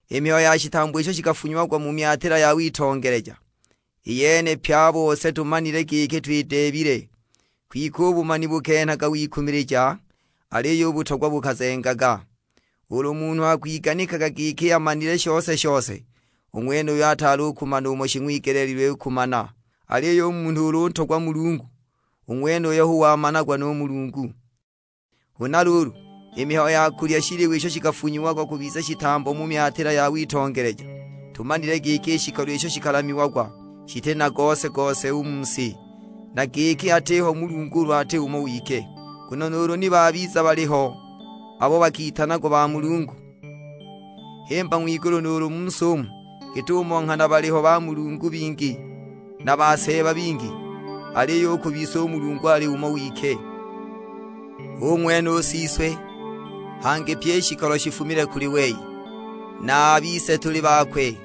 I mihayo ya shitambo isho shikafunyiagwa mu myatila ya witongeleja, i yene pye a bose tumanile giki twideebile; kwike u bumani bukenhaga wikumilija, aliyo u butogwa bukazengaga. Ulu munhu akwiganikaga giki amanile shose-shose, u ng'wenuyo ataali u kumana umo shing'wigeleelilwe kumana. Aliyo u munhu ulu untogwa Mulungu, u ng'wenuyo hu wamanagwa nu Mulungu. Huna luulu, i mihayo ya kulya shiliwa isho shikafunyiagwa kubiza shitambo mu myatila ya witongeleja; tumanile giki i shikolo isho shikalamiagwa shiti na gose-gose u mu si, na giki atiho Mulungu ulu ati umo wike. Nguno nuulu ni babiza baliho abo bakitanagwa bamulungu, himba ng'wigulu nuulu mu si umu; git'umo nghana baliho "bamulungu" bingi, na "baseeba" bingi, aliyo u ku bise u Mulungu ali umo wike; hu ng'wene u Siswe. Hangi pyi i shikolo shifumile kuli wei, na a bise tuli bakwe;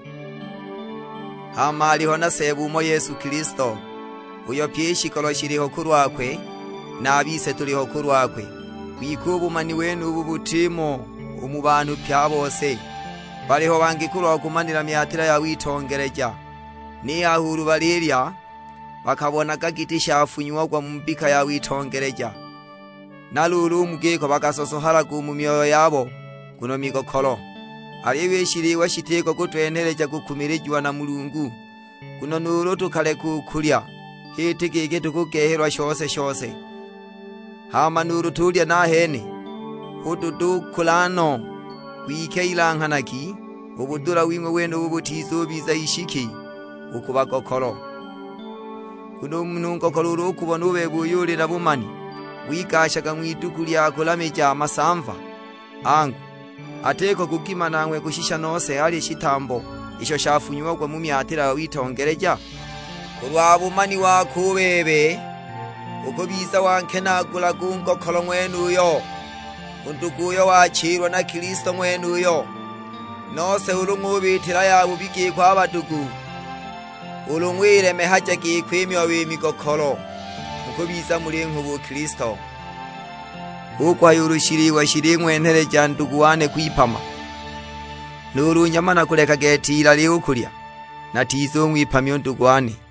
hama aliho na Seeba umo Yesu Kilisto, uyo pyi i shikolo shiliho kulwakwe, na a bise tuliho kulwakwe. Kwike u bumani wenubu butimo u mu banhu pye a bose, baliho bangi kulwa kumaniila myatila ya witongeleja, ni haha ulu balilya bakabonaga giti shafunyiagwa mu mbika ya witongeleja, na luulu u mu giko bakasosohalaga u mu myoyo yabo nguno migokolo! Aliyo i shiliwa shitiko kutwenheleja kukumilijiwa na Mulungu, nguno nuulu tukaleka u kulya h'iti giki tukugehelwa shose-shose, hama nuulu tuulya nahene hu dutukula no! Kwike ilanghanagi, u budula wing'we wenubu butizubiza ishiki u ku bagokolo. Nguno u munhu ngokolo ulu ukubona u bebe uyo uli na bumani wigashaga ng'widuku lya kulamija masamva, angu, atiko kugima nanghwe kushisha nose alye shitambo isho shafunyiagwa mu myatila ya witongeleja? Kulwa bumani wako u bebe, ukubiza wankenaagula u ngokolo ng'wenuyo; u ndugu uyo wachililwa na Kilisto ng'wenuyo! Nose ulu ng'ubiitila yabubi giko a badugu, ulu ng'wilemehaja giko i myoyo i migokolo, mukubiza mulinghuba u Kilisto. Hu kuhaya ulu shiliwa shiling'wenheleja ndugu wane kwipama, nuulu nyama nakuleka gete ilali u kulya, natizung'wipamya u ndugu wane.